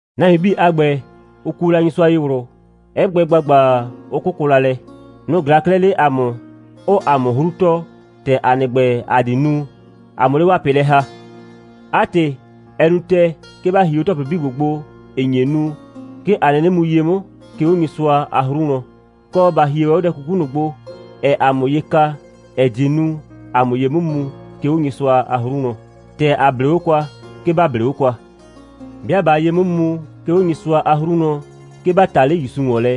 Nahuin 'bii a ‑gbɛ, ʋ kuo la Nyɩsʋa ye ꞊wlʋ, 'ɛ gbɛ ‑gbagba, 'ʋ 'kʋkʋ la lɛ. Nʋ‑ ꞊glaa 'klɛɛ 'le ‑a mʋ, 'ʋʋ ‑a mʋ 'hru tɔɔ, ‑tɛ ‑a nɩ ‑gbɛ, ‑a di nu, ‑a 'mʋ 'le 'waa ꞊pɩ lɛ ‑ha. 'A ‑tɩ, ɛ nu ‑tɛɛ, 'ke ‑ba hie 'o ‑tɔplɩ 'bii ‑gbo gbo, ‑ɩ nye nu, 'ke ‑a 'nɩnɩ mu ye 'mʋ, 'ke 'o Nyɩsʋa a 'hru wlɔn. Kɔ, ‑ba hie ‑wɛ 'o dɛ 'kuku ꞊nʋ gbo, ‑ɛɛ ‑a mʋ ye ka, ‑ɛ die nu, ‑a 'mʋ ye 'mʋ mu, 'ke 'o Nyɩsʋa a 'hru wlɔn. ‑Tɛ ‑a 'blee 'o kwa, 'ke ‑ba 'blee 'o kwa. 'Bɩa ꞊baa ye 'mʋ mu, 'ke 'o Nyɩsʋa a 'hru wlɔn, 'ke ‑ba ta 'le ‑Yusu ‑wɔn lɛ,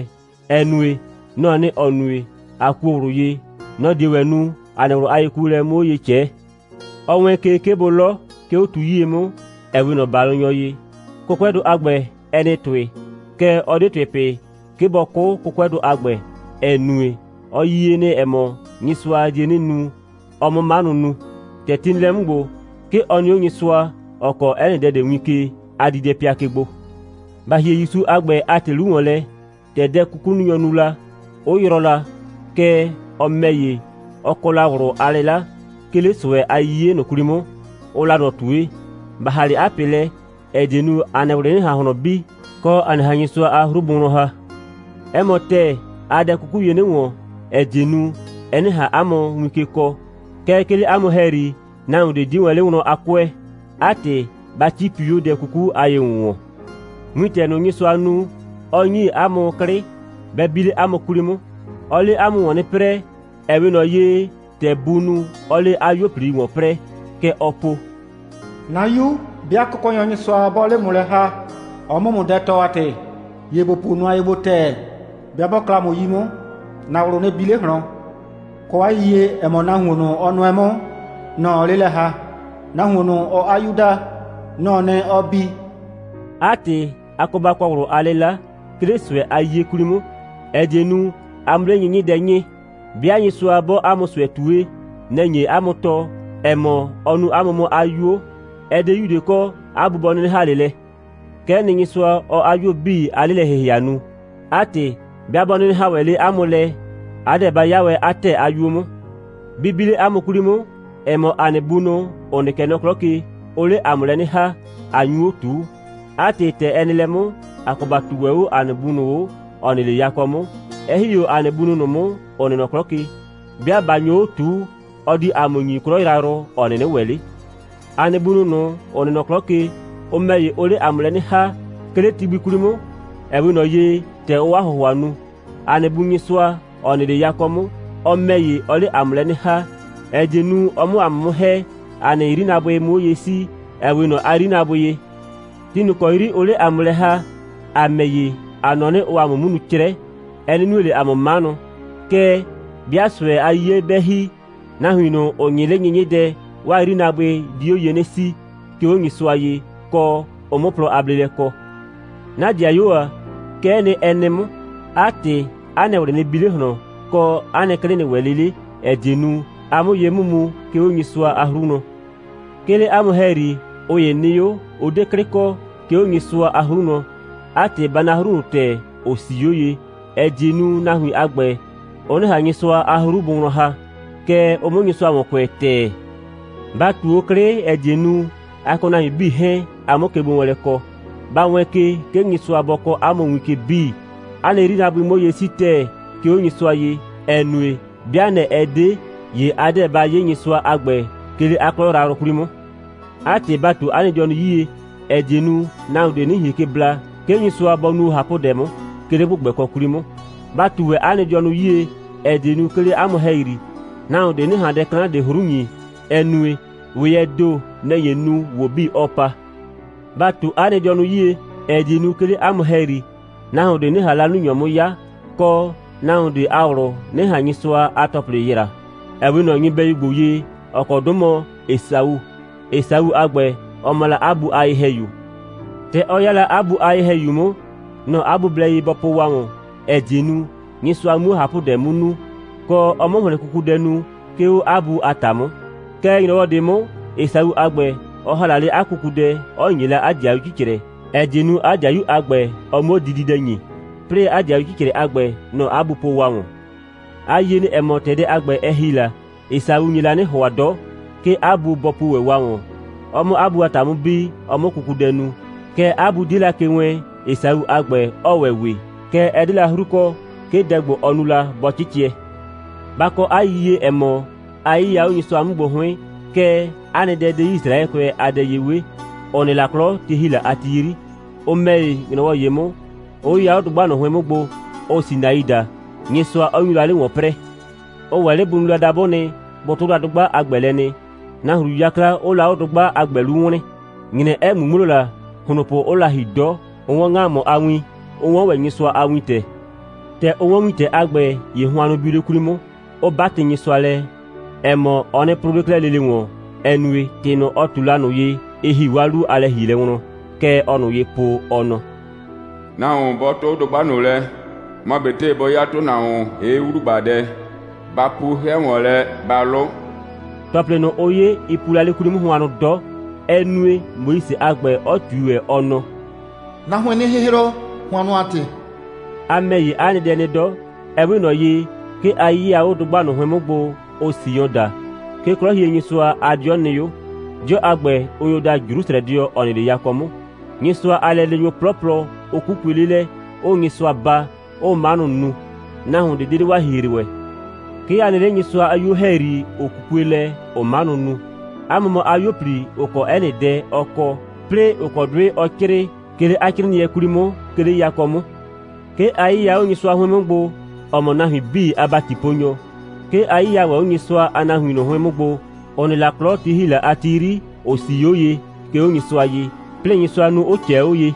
‑ɛ nue, nɔ‑ɔ nɩ, ‑ɔ nue, ꞊a kuo ꞊wlʋ ye, nɔ‑ die ‑wɛ nu, ‑a nɩ ꞊wlʋ a yekuolɛ 'mʋ 'o ye ꞊cɛɛ. Ɔ wɛɛn ke, 'ke bʋ 'lɔ, 'ke 'o tu 'yie 'mʋ, ‑ɛ 'we ꞊nɔ ‑balʋnyɔ ye. 'Kʋkʋɛdʋ a ‑gbɛ, ɛ nɩ ‑tʋɩ, kɛɛ, ɔ 'de ‑tʋɩ pɩ, 'ke bɔ 'kʋ 'kʋkʋɛdʋ a ‑gbɛ, ‑ɛ nue, ɔ yie nɩ, ‑ɛ mɔ, Nyɩsʋa die 'nɩ nu, ɔ 'mʋ 'manʋ nu. ‑Tɛ ti nɩ lɛ 'mʋ ‑gbo, 'ke ɔ nɩ 'o Nyɩsʋa, ‑ɔ kɔɔ 'ɛ nɩ dɛ ꞊de win ke a diidɛpɩa ke gbo. Ba ‑hie ‑Yusu a ‑gbɛ a ‑tɩ 'lu ‑wɔn lɛ, ‑tɛ dɛ'kukununyʋ nu la, 'ʋ yrɔɔ la, kɛɛ, ɔ ‑mɛ ‑ye, ɔ kɔ la ꞊wlʋ a 'lɩla, 'ke 'le ꞊sʋɛ a 'yiye ꞊nʋ 'kwli 'mʋ, ʋʋ la ꞊nɔ ꞊tue. Ba ‑ha 'le 'a ꞊pɩ lɛ, ‑ɛ die nu, 'a nɩ ꞊wlɩ 'nɩ ꞊han ꞊hlɔn bi, kɔ, a 'nɩ ꞊han Nyɩsʋa a 'hru bʋ wlɔn ‑ha. 'Ɛ mɔ ‑tɛɛ, aa dɛ 'kuku ye 'nɩ ‑wɔn, ‑ɛ die nu, ɛ 'nɩ ꞊han 'a mʋ win ke kɔɔ. Kɛɛ, 'ke 'le 'a mʋ ‑hɛyri, nahuon ꞊de 'die wɛn 'le wlɔn a 'kʋɛ. 'A ‑tɩ, ba 'cipi 'o dɛ 'kuku a ye‑wʋnwɔn. Wintɛ ꞊nʋ, Nyɩsʋa nu, 'ɔ ‑nyi 'a mʋ 'klɩ, bɛ bi 'le 'a mʋ 'kwli 'mʋ. Ɔɔ 'le 'a mʋ ‑wɔn 'nɩ 'prɛɛ, ‑ɛ 'we ꞊nɔ ye, ‑tɛ buu nu, 'ɔɔ 'le 'a 'yuo꞊pli ‑wɔn 'prɛɛ. Kɛ ɔɔ po: «'Na 'yu, 'bɩa Kʋkɔnyɔ Nyɩsʋa 'bɔɔ 'le ‑mʋ lɛ ‑ha, ɔ 'mʋ ‑mʋ dɛ tɔɔ a ‑tɩ, ‑ye ‑bo puo nʋa ye gbo ‑tɛɛ. 'Bɩa 'bɔ 'kla ‑mʋ 'yi 'mʋ, ‑na ꞊wlʋ nɩ bi 'le ꞊hlɔn. Kɔ 'a yiyie, ‑ɛ mɔ, nahuon ꞊nʋ, ɔ nʋɛ 'mʋ, nɔ‑ ɔɔ 'le lɛ ‑ha. Nahuon ꞊nʋ, ɔɔ 'a 'yu daa, nɔ‑ɔ nɩ, ɔɔ bi.» 'A ‑tɩ, a kɔ ba kɔ ꞊wlʋ a 'lɩla, 'ke 'le ꞊sʋɛ a 'yiye 'kwli 'mʋ, ‑ɛ die nu, a 'mʋ 'le 'nyɩnyɩdɛ 'nyɩɩ. 'Bɩa Nyɩsʋa 'bɔɔ 'a mʋ ꞊sʋɛ ꞊tue, nɛ‑ nye 'a mʋ tɔɔ, ‑ɛ mɔ, ɔ nuu 'a mʋ 'mʋ 'a 'yuo. Ɛ 'de 'yu ꞊de kɔ, 'a bu bɔ 'nɩnɩ ‑ha 'le lɛ. Kɛ'ɛ nɩ, Nyɩsʋa, ɔɔ 'a 'yuo 'bii a 'lelɛ‑hɩhɩa nu. 'A ‑tɩ, 'bɩa 'bɔ 'nɩnɩ ‑ha wɛn 'le 'a mʋ lɛ, a 'deɛ ba 'ya wɛn 'a ‑tɛɛ a 'yuo 'mʋ. Bɩ bi 'le 'a mʋ 'kwli 'mʋ, ‑ɛ mɔ, ‑a nɩ bunʋ, ‑ʋ nɩ kɛ nɔ 'klɔ ke, ʋʋ 'le ‑a mʋ lɛ 'nɩ ‑ha, ꞊a nyu 'o ꞊tuu. 'A ‑tɩ, ‑tɛ ɛ nɩ lɛ 'mʋ, ‑a kɔ ‑ba ꞊tuu ‑wɛ 'o ‑a nɩ Bu ꞊nʋ 'o, ‑ɔ nɩ 'le yakɔ 'mʋ, 'ɛ ‑hi 'o ‑a nɩ bunʋ ꞊nʋ 'mʋ, ‑ʋ nɩ nɔ 'klɔ ke. 'Bɩa ꞊ba nyo 'o ꞊tuu, ɔ di ‑a mʋ ‑nyi 'klɔ yrayrʋ, ‑ɔ 'nɩnɩ ‑wɛ 'le. ‑A nɩ bunʋ ꞊nʋ, ‑ʋ nɩ nɔ 'klɔ ke, ʋ ‑mɛ ‑ye, ʋʋ 'le ‑a mʋ lɛ 'nɩ ‑ha, 'ke 'le ti gbi 'kwli 'mʋ, ‑ɛ 'we ꞊nɔ ye, ‑tɛ ʋʋ 'a ‑hʋhʋa nu. ‑A nɩ Bu Nyɩsʋa, ‑ɔ nɩ 'le yakɔ 'mʋ, ɔ ‑mɛ ‑ye, ɔɔ 'le ‑a mʋ lɛ 'nɩ ‑ha, ‑ɛ die nu, ɔ 'mʋ ‑a mʋ 'mʋ ‑hɛ, ‑a nɩ 'yrinaabʋɩ 'mʋ 'o ye 'sii, ‑ɛ 'we ꞊nɔ 'a 'yrinaabʋɩ ye. Ti ꞊nʋ ‑kɔ 'yri ʋʋ 'le ‑a mʋ lɛ ‑ha, ‑a ‑mɛ ‑ye, ‑a nɔ 'nɩ, ʋʋ ‑a mʋ 'mʋ nu 'crɛ, ɛ 'nɩ nue ꞊le ‑a mʋ 'manʋ. Kɛɛ, 'bɩa ꞊sʋɛ a 'yiye 'bɛ ‑hi, nahuin ꞊nʋ, ‑ʋ 'nyɩɩ 'le 'nyɩnyɩdɛ, 'waa 'yrinaabʋɩ di 'o ye 'nɩ 'sii, 'ke 'o Nyɩsʋa ye, kɔ, ʋ 'mʋ plɔ a bleelɛ kɔ. 'Na ‑dɩayuo ‑a, kɛ'ɛ nɩ, ɛ nɩ 'mʋ. 'A ‑tɩ, 'a nɩ ꞊wlɩ nɩ bi 'le ꞊hlɔn, kɔ, 'a nɩ 'klɩ nɩ ‑wɛ 'le 'le, ‑ɛ die nu, a 'mʋ ye 'mʋ mu, 'ke 'o Nyɩsʋa a 'hru wlɔn. 'Ke 'le 'a mʋ ‑hɛyri, ꞊ʋ ‑ye nɩ 'o, 'ʋ 'de 'klɩ kɔ, 'ke 'o Nyɩsʋa a 'hru wlɔn. 'A ‑tɩ, ba na 'hru ꞊nʋ ‑tɛɛ, ‑ʋ 'sii 'o ye, ‑ɛ die nu, nahuin a ‑gbɛ, ʋ 'nɩ ꞊han Nyɩsʋa a 'hru bʋ wlɔn ‑ha, kɛɛ, ʋ 'mʋ Nyɩsʋa ‑wɔn kʋɛ ‑tɛɛ. Ba ꞊tu 'o 'klɩ, ‑ɛ die nu, a kɔ nahuin 'bii 'hɛɛn, a 'mʋ kegbowɛɛnlɛ kɔ. Ba wɛɛn ke, 'ke Nyɩsʋa bɔ kɔɔ 'a mʋ win ke 'bii, 'a nɩ 'yrinaabʋɩ 'mʋ 'o ye 'sii ‑tɛɛ, 'ke 'o Nyɩsʋa ye, ‑ɛ nue, 'bɩa nɛ‑ ɛ 'de, ‑ye a 'deɛ ba 'ye Nyɩsʋa a ‑gbɛ, 'ke 'le 'a 'klɔ yrayrʋ 'kwli 'mʋ. 'A ‑tɩ, ba ꞊tu 'a nɩ dɩɔnʋ 'yie, ‑ɛ die nu, nahuon ꞊de 'nɩ ꞊hien ke bla, 'ke Nyɩsʋa bɔ nuo ꞊hapʋdɛ 'mʋ, 'ke 'le ‑gbʋgbɛkɔ 'kwli 'mʋ. Ba ꞊tu ‑wɛ 'a nɩ dɩɔnʋ 'yie, ‑ɛ die nu, 'ke 'le 'a mʋ ‑hɛyri, nahuon ꞊de 'nɩ ꞊han dɛ 'klan ꞊de 'hru ‑nyi, ‑ɛ nue, ‑weyɛɛ ‑do, nɛ‑ nye nu, ‑wo 'bii 'ɔɔ pa. Ba ꞊tu 'a nɩ dɩɔnʋ 'yie, ‑ɛ die nu, 'ke 'le 'a mʋ ‑hɛyri, nahuon ꞊de 'nɩ ꞊han 'lalunyɔ 'mʋ 'ya, kɔ, nahuon ꞊de a ꞊wlʋ 'nɩ ꞊han Nyɩsʋa a ‑tɔplɩ yraa, ‑ɛ 'we ꞊nɔ nyɩbɛyu ‑gbo ye, ‑ɔ kɔ 'dʋ mɔ Esau. Esau a ‑gbɛ, ɔ mɔ la 'a bu a ye‑hɛyu. ‑Tɛ ɔ 'ya la 'a bu a ye‑hɛyu 'mʋ, nɔ‑ 'a bu blɛ ye bɔ po wa ‑wɔn, ‑ɛ die nu, Nyɩsʋa 'muo ꞊hapʋdɛ 'mʋ nu, kɔ, ɔ 'mʋ ‑hlɩn kukudɛ nu, 'ke 'o 'a bu a ‑ta 'mʋ. Kɛɛ, ‑nyrɔwɔ ꞊de 'mʋ, Esau a ‑gbɛ, ɔ ‑ha la 'le 'a kukudɛ, 'ɔ ‑nye la 'a 'dɩayu 'cicrɛ, ‑ɛ die nu, 'a 'dɩayu a ‑gbɛ, ɔ 'muo dididɛ ‑nyi, 'plɩɩ 'a 'dɩayu 'cicrɛ a ‑gbɛ, nɔ‑ 'a bu po wa ‑wɔn. A yie nɩ, ‑ɛ mɔ, ‑tɛ dɛ a ‑gbɛ, ɛ ‑hi la, Esau nye la 'nɩ ‑hʋa 'dɔ, 'ke 'a bu bɔ puo ‑wɛ wa ‑wɔn, ɔ 'mʋ 'a bu a ‑ta 'mʋ bi, ɔ 'mʋ kukudɛ nu. Kɛɛ, 'a bu 'die la ke wɛɛn, Esau a ‑gbɛ 'ɔɔ ‑wɛ we, kɛɛ, ɛ 'de la 'hru kɔ, 'ke dɛ ‑gbo, ɔ nu la, bɔ 'cɩcɩɛ. Ba kɔ 'a yiyie, ‑ɛ mɔ, a 'yɩya 'o Nyɩsʋa 'mʋ gbo 'hʋɩn, kɛɛ, 'a nɩ dɛ 'de Yisraɛkʋɛ a dɛ ye 'we, ‑ʋ nɩ la 'klɔ, ti ‑hi la a ti 'yri. Ʋ ‑mɛ ‑ye, ‑nyrɔwɔ ‑ye 'mʋ, 'ʋ 'yɩya 'o dʋgba ꞊nʋ 'hʋɩn 'mʋ gbo, ʋʋ Sinai daa, Nyɩsʋa 'ɔ nyu la 'le ‑wɔn 'prɛɛ. Ʋ ‑wɛ 'le bʋ nu la dabʋ nɩ, bʋ 'tʋ la dʋgba a ‑gbɛ lɛ nɩ, nahru 'yakla 'ʋʋ la 'o dʋgba a ‑gbɛ 'lu wlɩɩn, ‑nyrɛ 'ɛ ꞊ŋmuŋmlo la, ‑hlonpʋ 'ʋʋ la ‑hi 'dɔ, 'ʋ 'wɔn ‑ŋamʋ a win, 'ʋ 'wɔn ‑wɛ Nyɩsʋa a wintɛ. ‑Tɛ ʋ 'wɔn wintɛ a ‑gbɛ, ‑ye hʋannʋ biu 'le 'kwli 'mʋ, 'ʋ 'batɩ Nyɩsʋa lɛ, ‑ɛ mɔ, ɔ nɩ 'prʋʋ 'le 'klɛɛ lele ‑wɔn, ‑ɛ nue, ‑tɩ ꞊nʋ, ɔ ꞊tu la ꞊nʋ ye, ɩ ‑hi 'waa 'lu a lɛ‑hielɛ wlɔn. Kɛ ɔɔ ꞊nʋ ye po, ɔ nɔ: «Nahuon 'bɔ 'tʋ dʋgba ꞊nʋ lɛ, mɔ ꞊betɩ bɔ 'ya ‑tʋnahuon, ‑hee' 'wlugbadɛ, ba pu 'hɛ ‑wɔn lɛ, ba 'lʋ.» ‑Tɔplɩ ꞊nʋ, ʋ 'ye, ɩ pu la 'le 'kwli 'mʋ hʋannʋ 'dɔ. Ɛ nue, Moise a ‑gbɛ, 'ɔ ꞊tui ‑wɛ, ɔ nɔ: «'Na 'hʋɩɩn 'nɩ 'hɩhrɔ, hʋannʋ a ‑tɩ.» A ‑mɛ ‑ye, 'a nɩ dɛ nɩ 'dɔ. Ɛ 'we ꞊nɔ ye, 'ke a 'yɩya 'o dʋgba ꞊nʋ 'hʋɩn 'mʋ gbo, ʋʋ Sion daa. 'Ke 'Klɔhienyɩsʋa a 'dɩɔ nɩ 'o. 'Dɩɔ a ‑gbɛ, ʋ nyo daa Jrusrɛdɩɔ, ‑ɔ nɩ 'le yakɔ 'mʋ. Nyɩsʋa a lɛleenyʋ 'plɔplɔ, ʋ 'kukue 'le lɛ, 'ʋʋ Nyɩsʋa baa, 'ʋʋ 'manʋ nu. Nahuon ꞊de 'de 'le 'waa ‑hihre ‑wɛ. 'Ke a nɩ 'le Nyɩsʋa a 'yuo ‑hɛyri, ‑ʋ 'kukue lɛ, ‑ʋʋ 'manʋ nu. 'A mʋ mɔ 'a 'yuo꞊pli, ‑ʋ kɔ 'ɛ nɩ dɛ, ɔ kɔ, 'plɩɩ, ‑ʋ kɔ 'dʋɩ ɔ 'crɩɩ, 'ke 'le 'a 'crɩɩnɩɛ 'kwli 'mʋ, 'ke 'le yakɔ 'mʋ. 'Ke a 'yɩya 'o Nyɩsʋa 'hʋɩn 'mʋ gbo, ‑ɔ mɔ nahuin 'bii a ‑batiponyɔ. 'Ke a 'yɩya ‑wɛ 'o Nyɩsʋa a nahuin ꞊nʋ 'hʋɩn 'mʋ gbo, ‑ʋ nɩ la 'klɔ, ti ‑hi la a ti 'yri, ‑ʋ 'sii 'o ye, 'ke 'o Nyɩsʋa ye, 'plɩɩ Nyɩsʋa nu, 'ʋ ꞊cɛɛ 'o ye.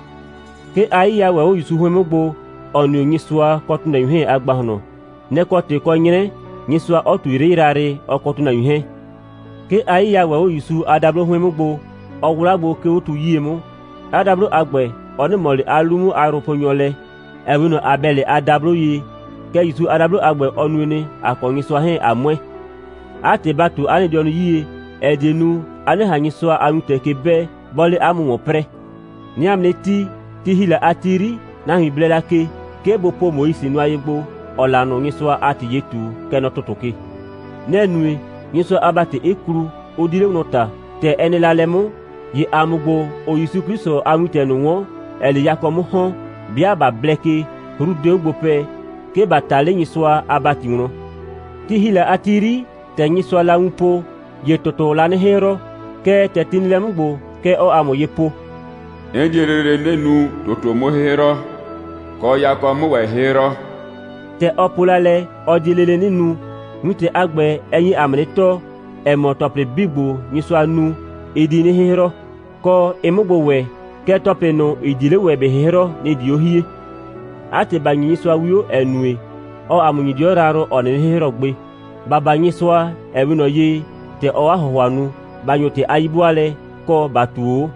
'Ke a 'yɩya ‑wɛ 'o ‑Yusu 'hʋɩn 'mʋ gbo, ‑ɔ nɩ 'o Nyɩsʋa kɔ ‑tʋnahuin 'hɛɛn a ‑gbahlɔn. Nɛ‑ kɔ ‑tɩ kɔ 'nyrɛ, Nyɩsʋa 'ɔ ꞊tu 'yrɩ yrayrɩ, ɔ kɔ ‑tʋnahuin 'hɛɛn. 'Ke a 'yɩya ‑wɛ 'o ‑Yusu a dablo 'hʋɩn 'mʋ gbo, ɔ 'wla gbo, 'ke 'o tu 'yie 'mʋ. 'A dablo a ‑gbɛ, ɔ 'nɩ ꞊mɔ ꞊le 'a 'lu 'mʋ a yrʋponyɔ lɛ, ‑ɛ 'we ꞊nɔ Abɛlɩ a dablo ye, kɛɛ, ‑Yusu a dablo a ‑gbɛ, ɔ nue nɩ, ‑a kɔ Nyɩsʋa 'hɛɛn, ꞊a ‑mʋɛ. 'A ‑tɩ, ba ꞊tu 'a nɩ dɩɔnʋ 'yie, ‑ɛ die nu, a 'nɩ ꞊han Nyɩsʋa a wintɛ ke 'bɛɛ, 'bɔɔ 'le 'a mʋ ‑wɔn 'prɛɛ. 'Nɩɩ 'a mʋ 'nɩ tii: Ti ‑hi la a ti 'yri, nahuin blɛ la ke, 'ke bʋ po Moise nʋa ye gbo, ‑ɔɔ la ꞊nʋ Nyɩsʋa a ‑tɩ ye ꞊tu, kɛ nɔ ‑tʋtʋ ke. Nɛ‑ nue, Nyɩsʋa a ‑bati 'ɩ klu, 'ʋ 'di 'le wlɔn ꞊ta. ‑Tɛ ɛ nɩ la lɛ 'mʋ, ‑ye ‑a mʋ ‑gbo, ‑ʋʋ ‑Yusu 'Klɩsʋ a wintɛ ꞊nʋ 'wɔn, ‑ɛɛ 'le yakɔ 'mʋ ‑hɔn, 'bɩa ꞊ba blɛ ke, 'hru 'de 'o gbo pɛ, 'ke ‑ba ꞊ta 'le Nyɩsʋa a ‑bati wlɔn. Ti ‑hi la a ti 'yri, ‑tɛ Nyɩsʋaa la wun po, ‑ye ‑tʋtʋʋ la 'nɩ 'hɩhrɔ. Kɛɛ, ‑tɛ ti nɩ lɛ 'mʋ ‑gbo, kɛ ɔɔ ‑a mʋ ye po: «'N die lele 'nɩ nu, ‑tʋtʋ 'mʋ 'hɩhrɔ, kɔ, yakɔ 'mʋ ‑wɛ 'hɩhrɔ.» ‑Tɛ ɔ po la lɛ, ɔ die lele 'nɩ nu, wintɛ a ‑gbɛ, ɛ nye ‑a mʋ 'nɩ tɔɔ, ‑ɛ mɔ, ‑tɔplɩ 'bii ‑gbo, Nyɩsʋa nu, ɩ di 'nɩ 'hɩhrɔ, kɔ, ɩ 'mʋ gbo ‑wɛ. Kɛɛ, ‑tɔplɩ ꞊nʋ, ‑ɩ 'die 'le ‑wɛ ‑bɩ 'hɩhrɔ, nɩ‑ di 'o hie. 'A ‑tɩ, ‑ba ‑nyi Nyɩsʋa 'wio, ‑ɛ nue, ɔɔ ‑a mʋ ‑nyi 'dɩɔ yrayrʋ, ‑ɔ 'nɩnɩ 'hɩhrɔ gbe. ‑Ba baa Nyɩsʋa, ‑ɛ 'we ꞊nɔ ye, ‑tɛ ɔɔ 'a ‑hʋhʋa nu. ‑Ba ‑nyo ‑tɩ a 'yi'bʋaalɛ, kɔ, ‑ba ꞊tuo 'o.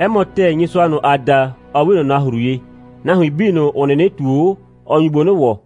'Ɛ mɔ ‑tɛɛ, Nyɩsʋa ꞊nʋ, ‑aa da, ɔ 'we ꞊nɔ nahru ye. Nahuin 'bii ꞊nʋ, ‑ʋ 'nɩnɩ ꞊tuo 'o, ɔ nyu gbo 'nɩ ‑wɔ.